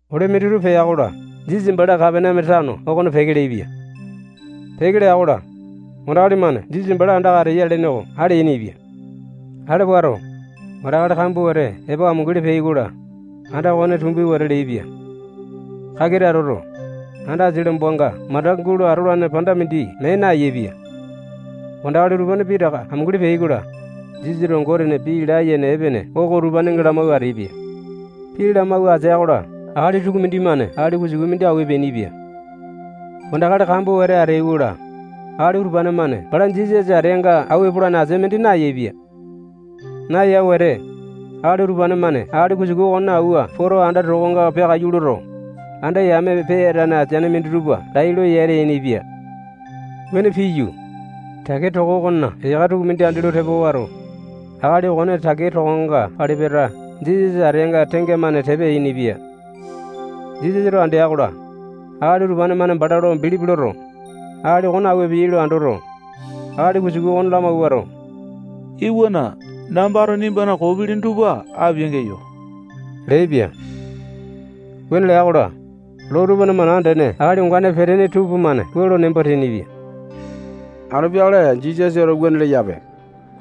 Ole minditupa pea-kola, Jisasa bala Kapaneame tano okona peke leaipia. Peke lea-kola, wandakali-mane Jisasa bala andaka ateya lene oko ale yainipia. Ale wato, wandakali kambua wete epo amunguli peai-kola, anda okone tumbi wete leaipia. Takita atoto, anda asia lombanga mandaka gulo atolane panda mindi mee nayaepia. Wandakali utupane pitaka amunguli peai-kola, Jisasato Gotena pii layene epene oko utupanenga lamawua ateaipia. Pii lamawua atea-kola, akali tukumindi-mane akali kusuku mindi awua epeainipia. Wandakali kambua wete ateai-kola, akali utupane-mane bala Jisasa ateanga awua epolane asia mindi nayaepia. Naya wete, akali utupane-mane akali kusuku okone awua poto, anda tokonga peakaiyu loto, anda yame peyatane ateane minditupa lai lo yata yainipia. Wuane piyu, takea toko okona eyaka tukumindi andi lo tepa wato, akali okone takea tokonga pali-pata Jisasa ateanga tengamane tepa yainipia. Jisasato andea-kola, akali utupane-mane bala lo bilipi loto, akali okone awua epeai lo andoto, akali kusuku okone lamawuato, iwana, nambato nimbana koo pilini tupa apia-geyo leaipia. Wuane lea-kola, loo tupana mana andene akali ongane peteaini tupamane wua lo nembo teainipia: Anu peakale Jisasato wuane leyape.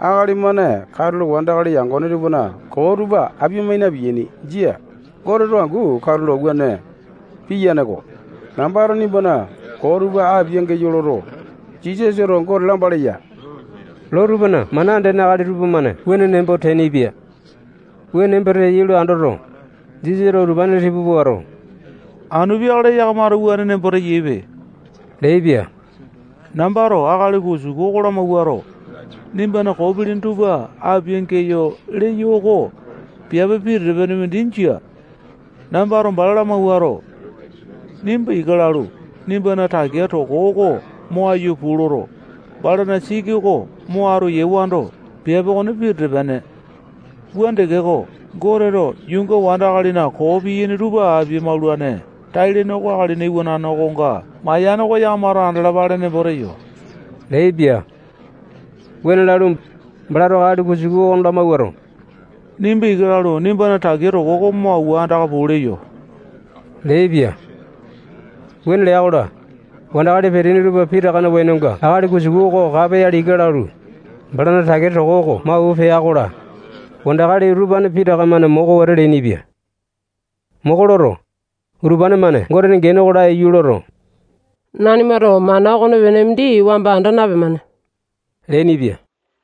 Akali-mane katulo wandakali yangone tupana koo tupa apia-mai na-piyaini. Jia. Goteto angu katulo wuane piyane-ko. Nambato nimbana koo tupa apia-geyo loto, Jisasato Gote lamba leya. Loo tupana mana andene akali tupamane wuane nembo teainipia. Wuane nembo teyai lo andoto, Jisasato utupane tipa puato, anu peakale yakamato wuane nembo teyaipe leaipia. Nambato akali kusuku oko lamawuato, nimbana koo pilini tupa apia-geyo leyo oko piape pitete-pene mindi jia. Nambato bala lamawuato, nimba ika lalu, nimbana takea toko oko mo aiyu puu loto, balana siki oko mo atu yewando, piape okone pitete-pene. Wuane tekeko, Goteto yuunga wandakalina koo piyaini tupa apia-maulane tai-lene oko Akalina Iwanane okonga mayane oko yakamato andalapale nembo teyo leaipia. Wuane lalu, balato akali kusuku oko lamawuato, nimba ika lalu, nimbana takea toko oko mo awua andaka puu leyo leaipia. Wuane lea-kola, wandakali peteaini tupa pitakana wenonga akali kusuku oko kapoyale ika lalu, balana takea toko oko mo awua pea-kola, wandakali utupane pitaka-mane moko wete leainipia. Moko loto, utupane-mane Gotena gene oko laiyu loto, nanimato mana okonepene mindi wamba anda napemane leainipia.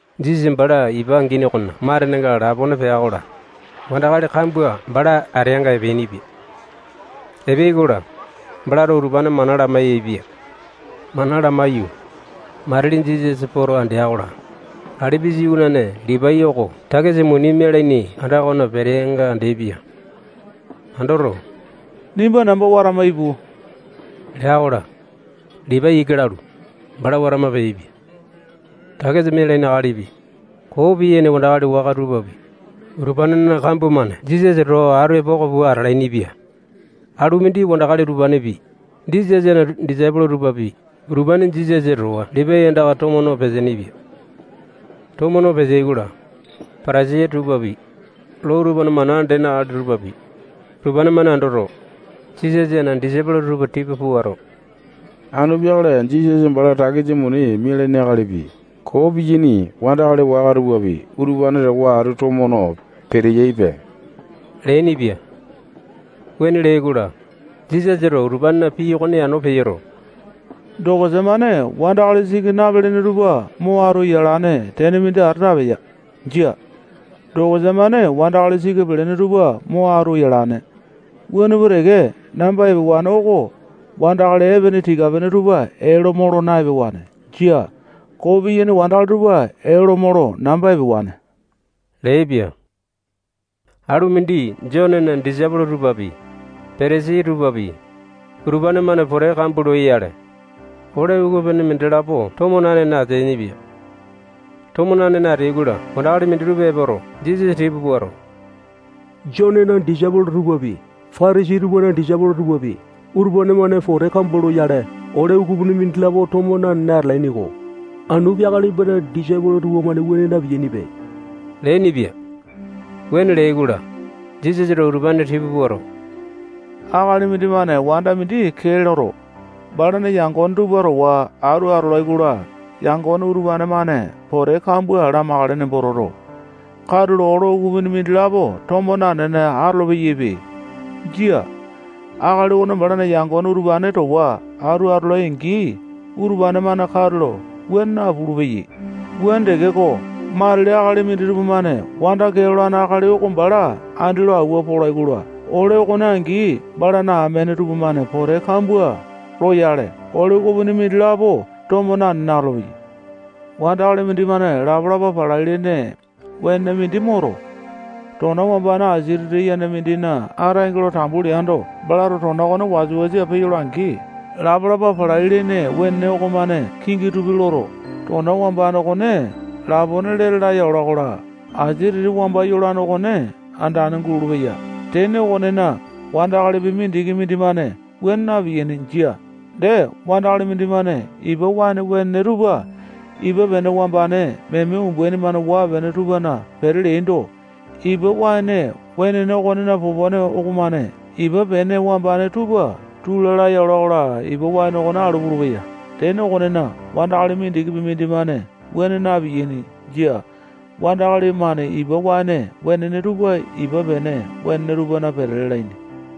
Jisasa bala ipa angini okona matenenga lapone pea-kola, wandakali kambua bala ateanga epeainipia. Epeai-kola, balato utupane mana lamai-yaepia. Mana lamaiyu, matili Jisasa poto andea-kola, Alipusa iwanane Lipai oko takisa muni mialaini anda okona peteanga andeaipia. Andoto, nimba namba watama ipu lea-kola, Lipai ika lalu, bala watama peaipia. Takisa mialaini akalipi, koo piyaini wandakali waka tupapi, utupanena kambua-mane Jisasa towa atu epoko pua atalainipia. Alu mindi wandakali utupanepi, Jisasana disaipolo tupapi, utupane Jisasa towa Lipai andaka tomo no peteaini-pia. Tomo no peteai-kola, Patasai tupapi, loo tupana mana andene akali tupapi, utupane-mane andoto, Jisasana disaipolo tupa tipa puato, anu peakale Jisasa bala takisa muni mialaini akalipi, koo piyaini wandakali waka tupapi, utupane towa atu tomo no peteyaipe leainipia. Wuane leai-kola, Jisasato utupanena pii okone yano peyoto, dokosa-mane wandakali siki napelene tupa mo atu yolane tene mindi ata napeya. Jia. Dokosa-mane wandakali siki pelene tupa mo atu yalane. Wuane pua teke, namba epewane oko wandakali epene tika-pene tupa ee lo molo na-epewane. Jia. Koo piyaini wandakali tupa ee lo molo namba epewane leaipia. Alu mindi Jonena disaipolo tupapi, Patasai tupapi, utupane-mane pote kambua loyale, ole ukupini mindilapo tomo nanene ateainipia. Tomo nanene ateai-kola, wandakali minditupa epoto, Jisasa tipa puato, Jonena disaipolo tupapi, Patasai tupana disaipolo tupapi, utupane-mane pote kambua loyale, ole ukupini mindilapo tomo nanene atalaini-ko. Anu peakale nimbana disaipolo tupamane wuane na-piyainipe leainipia. Wuane leai-kola, Jisasato utupane tipa puato, akali mindimane wanda mindi kee loto, balana yangone tupa towa atu atolai-kola, yangone utupane-mane pote kambua lamakale nembo toto, katulo ole ukupini mindilapo tomo nanene atolo-peyaipe. Jia. Akali okone balana yangone utupane towa atu atolai-angi, utupane-mane katulo wuane napulu-peyai. Wuane tekeko, matili akali minditupa-mane wanda kee lolane akali oko bala andi lo awua polai-kola, ole okone angi balana amene tupamane pote kambua loyale, ole ukupini mindilapo tomo nanene atolopeyai. Wandakali mindimane lapa-lapa palai-lene wenene mindi moto, tona wambane asia titi yene mindina ataenge lo tambu leando, balato tona okone wasa-wasa peyola-angi, lapa-lapa palai-lene wenene okomane kingi tupi loto, tona wambane okone lapone lete laya ola-kola, asia titi wamba yolane okone andane gulolo-peya. Tene okonena, wandakali mindikipi mindimane wuane na-piyaini. Jia. Dee, wandakali mindimane ipa waene wenene tupa ipa pene wambane meme umbaini-mane waa-pene tupana pete leando, ipa waene wenene okonena popone okomane ipa pene wambane tupa tula laya ola-kola, ipa waene oko alu pulupeya. Tene okonena, wandakali mindikipi mindimane wuane na-piyaini. Jia. Wandakali-mane ipa waene wenene tupa ipa pene wenene tupana pete lalaini.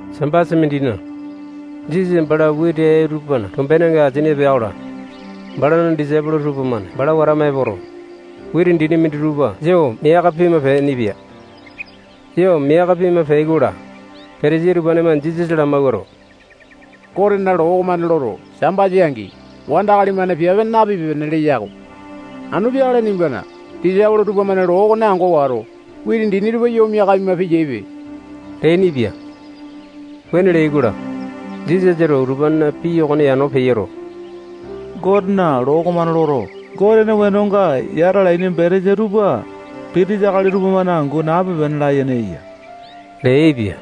Sambasa mindina, Jisasa bala witi ee tupana tombenenga asini epo pea-kola, balana disaipolo tupamane bala watama epoto, witi dini minditupa yo miaka pima peainipia. Yo miaka pima peai-kola, Patasai tupamane Jisasa lamawuato, Gotena loo okomane loto, Sambasa angi wandakali-mane piape napipe-pene leya-ko. Anu peakale nimbana disaipolo tupamane loo okone ango wato, witi dini tupa yo miaka pima peyaipe leainipia. Wuane leai-kola, Jisasato utupanena pii okone yano peyoto, Gotena loo okomane loto, Gote wenonga yata alaini betesa tupa pitisa akali tupamane angu nape-pene layene eya leaipia.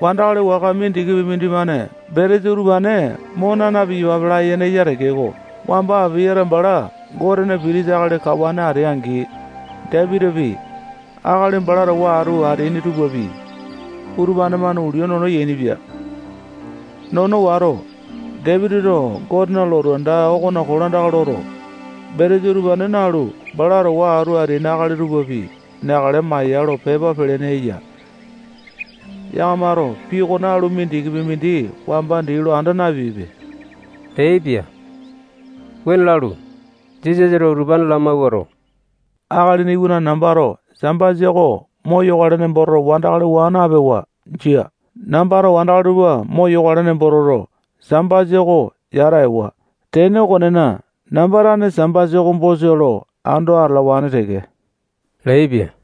Wandakali waka mindikipi mindimane betesa utupane mo naa na-piyapape layene eya tekeko, wamba Apayata bala Gotena pitisa akali kawane atea-angi, Dapitipi, akali bala towa atu ateaini tupapi, utupane-mane ulia nono yainipia. Nono wato, Dapitito Gotena lotu anda okona kolandaka loto, betesa utupane nalu, bala towa atu ateaini akali tupapi neakale maya lo pepa pelene eya. Yakamato pii okone alu mindikipi mindi wamba dii lo anda napeaipe leaipia. Wuane lalu, Jisasato utupane lamawuato, Akalina Iwanane nambato Sambasa oko moyokale nembo toto, wandakali waa napewa. Jia. Nambato wandakali tupa moyokale nembo toto, Sambasa oko yata ewa. Tene okonena, namba tane Sambasa oko bosa lo ando atalawane teke leaipia.